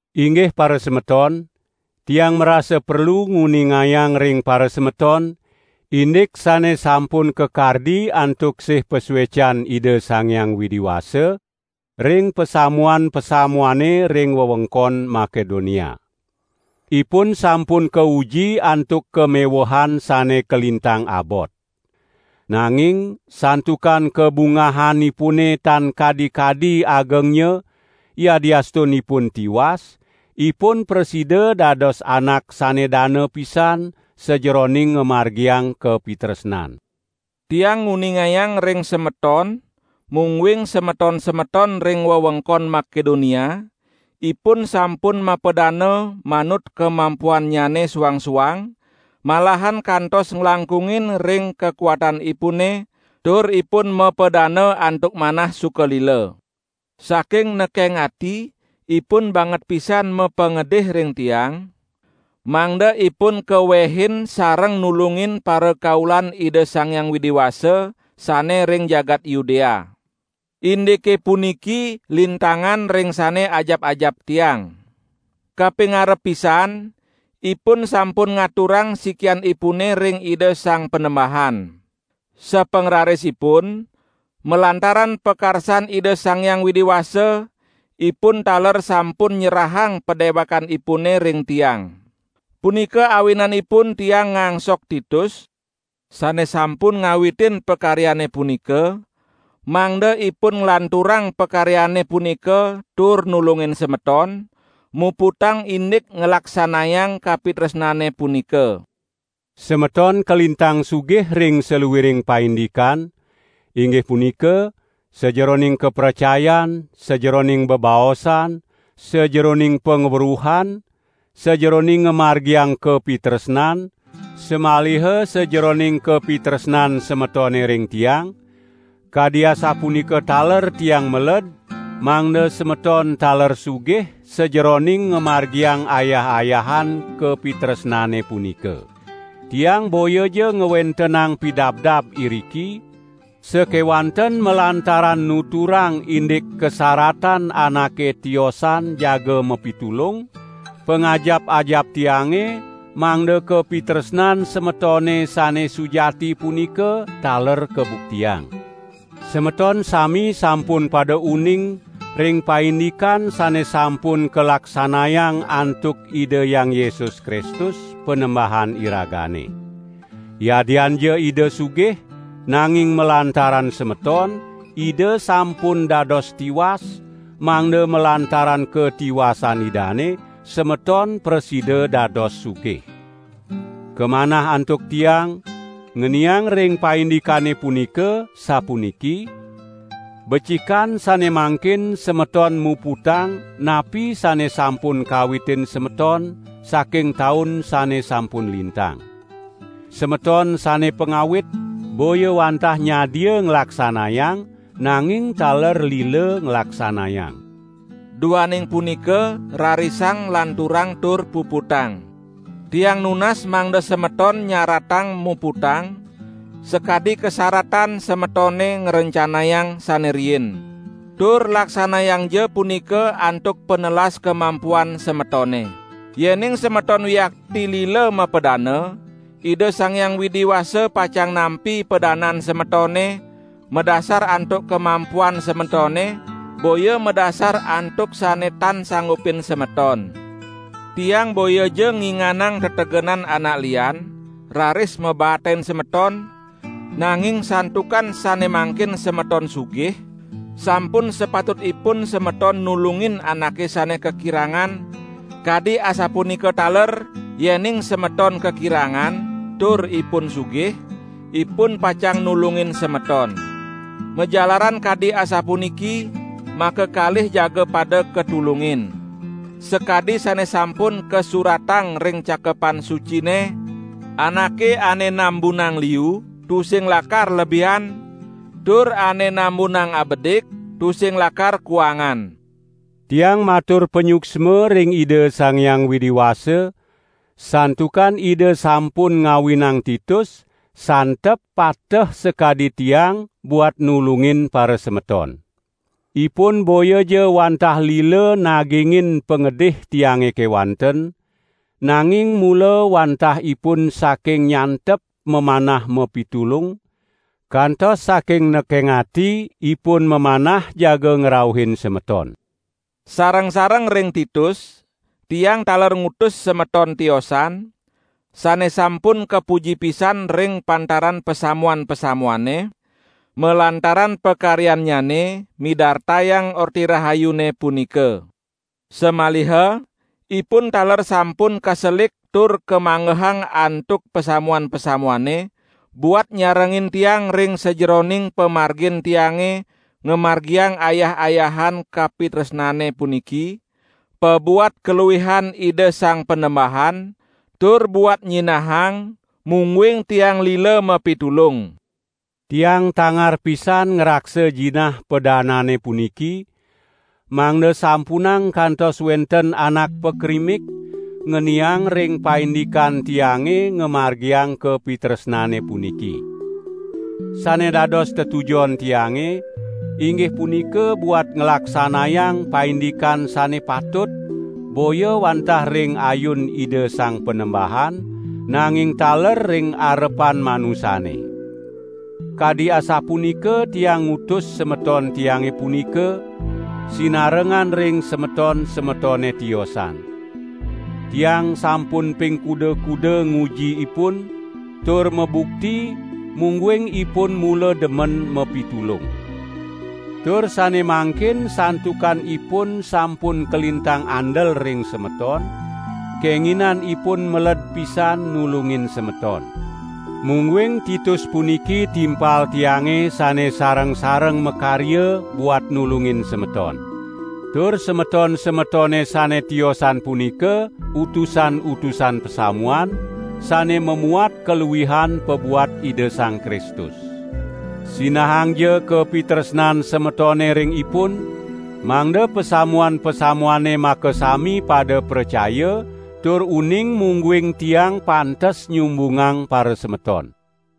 Inggih parasemeton, tiang marasa perlu nguningayang ring parasemeton, indik sane sampun kakardi antuk sih pasuecan Ida Sang Hyang Widi Wasa ring pasamuan-pasamuane ring wewengkon Makedonia. Ipun sampun kauji antuk kamewehan sane kalintang abot. Nanging, santukan kabungahanipune tan kadi-kadi agengnya, yadiastun ipun tiwas, ipun prasida dados anak sane dana pisan sajeroning ngamargiang kapitresnan. Tiang nguningayang ring semeton mungguing semeton-semeton ring wewengkon Makedonia, ipun sampun mapadana manut kamampuhannyane suang-suang, malahan kantos nglangkungin ring kakuatanipune, tur ipun mapadana antuk manah suka lila. Saking nekeng ati ipun banget pisan mapangedih ring tiang, mangda ipun kawehin sareng nulungin parakaulan Ida Sang Hyang Widi Wasa sane ring jagat Yudea. Indike puniki lintangan ring sane ajap-ajap tiang. Kapingarep pisan, ipun sampun ngaturang sikianipune ring Ida Sang Panembahan. Sapangrarisipun, malantaran pakarsan Ida Sang Hyang Widi Wasa, ipun taler sampun nyerahang padewekanipune ring tiang. Punika awinanipun tiang ngangsok Titus, sane sampun ngawitin pakaryane punika, mangda ipun nglanturang pakaryane punika tur nulungin semeton, muputang indik nglaksanayang kapitresnane punika. Semeton kalintang sugih ring saluiring paindikan, inggih punika: Sajeroning kapracayan, sajeroning bebaosan, sajeroning pangweruhan, sajeroning ngamargiang kapitresnan, samaliha sajeroning kapitresnan semetone ring tiang, kadi asapunika taler tiang meled mangda semeton taler sugih sajeroning ngamargiang ayah-ayahan kapitresnane punika. Tiang boyaja ngwentenang pidabdab iriki, sakewanten malantaran nuturang indik kasaratan anake tiosan jaga mapitulung, pangajap-ajap tiange mangda kapitresnan semetone sane sujati punika taler kabuktiang. Semeton sami sampun pada uning ring paindikan sane sampun kalaksanayang antuk Ida Hyang Yesus Kristus, Panembahan iragane. Yadianja Ida sugih, nanging malantaran semeton, Ida sampun dados tiwas, mangda malantaran katiwasan Idane, semeton prasida dados sugih. Kamanah antuk tiang, ngeniang ring paindikane punika sapuniki: becikan sane mangkin semeton muputang napi sane sampun kawitin semeton saking taun sane sampun lintang. Semeton sane pangawit, boya wantah nyadia nglaksanayang nanging taler lila nglaksanayang. Duaning punika rarisang lanturang tur puputang. Tiang nunas mangda semeton nyaratang muputang, sakadi kasaratan semetone ngrencanayang sane riin. Tur laksanayangja punika antuk panelas kamampuhan semetone. Yening semeton wiakti lila mapadana, Ida Sang Hyang Widi Wasa pacang nampi padanan semetone, madasar antuk kamampuhan semetone, boya madasar antuk sane tan sanggupin semeton. Tiang boyaja nginganang tetegenan anak lian, raris mabaatin semeton, nanging santukan sane mangkin semeton sugih, sampun sapatutipun semeton nulungin anake sane kakirangan; kadi asapunika taler yening semeton kakirangan, tur ipun sugih, ipun pacang nulungin semeton. Majalaran kadi asapuniki, makakalih jaga pada katulungin. Sakadi sane sampun kasuratang ring Cakepan Sucine: "Anake ane nambunang liu, tusing lakar lebihan, tur ane nambunang abedik tusing lakar kuangan." Tiang matur panyuksma ring Ida Sang Hyang Widi Wasa, santukan Ida sampun ngawinang Titus, santep pateh sakadi tiang buat nulungin parasemeton. Ipun boyaja wantah lila nagingin pangedih tiange kewanten, nanging mula wantah ipun saking nyantep mamanah mapitulung, kantos saking nekeng ati ipun mamanah jaga ngrauhin semeton. Sareng-sareng ring Titus, tiang taler ngutus semeton tiosan, sane sampun kapuji pisan ring pantaran pasamuan-pasamuane, malantaran pakaryannyane midartayang Orti Rahayune punika. Samaliha, ipun taler sampun kaselik tur kamanggehang antuk pasamuan-pasamuane, buat nyarengin tiang ring sajeroning pamargin tiange ngamargiang ayah-ayahan kapitresnane puniki, pabuat kaluihan Ida Sang Panembahan, tur buat nyinahang mungguing tiang lila mapitulung. Tiang tangar pisan ngraksa jinah padanane puniki, mangda sampunang kantos wenten anak pakrimik ngeniang ring paindikan tiange ngamargiang kapitresnane puniki. Sane dados tetujon tiange, inggih punika buat nglaksanayang paindikan sane patut boya wantah ring ayun Ida Sang Panembahan, nanging taler ring arepan manusane. Kadi asapunika tiang ngutus semeton tiange punika, sinarengan ring semeton-semetone tiosan. Tiang sampun ping kuda-kuda nguji ipun, tur mabukti mungguing ipun mula demen mapitulung. Tur sane mangkin santukan ipun sampun kalintang andel ring semeton, kenginan ipun meled pisan nulungin semeton. Mungguing Titus puniki timpal tiange sane sareng-sareng makarya buat nulungin semeton. Tur semeton-semetone sane tiosan punika utusan-utusan pasamuan, sane mamuat kaluihan pabuat Ida Sang Kristus. Sinahangja kapitresnan semetone ring ipun, mangda pasamuan-pasamuane makasami pada pracaya tur uning mungguing tiang pantes nyumbungang parasemeton.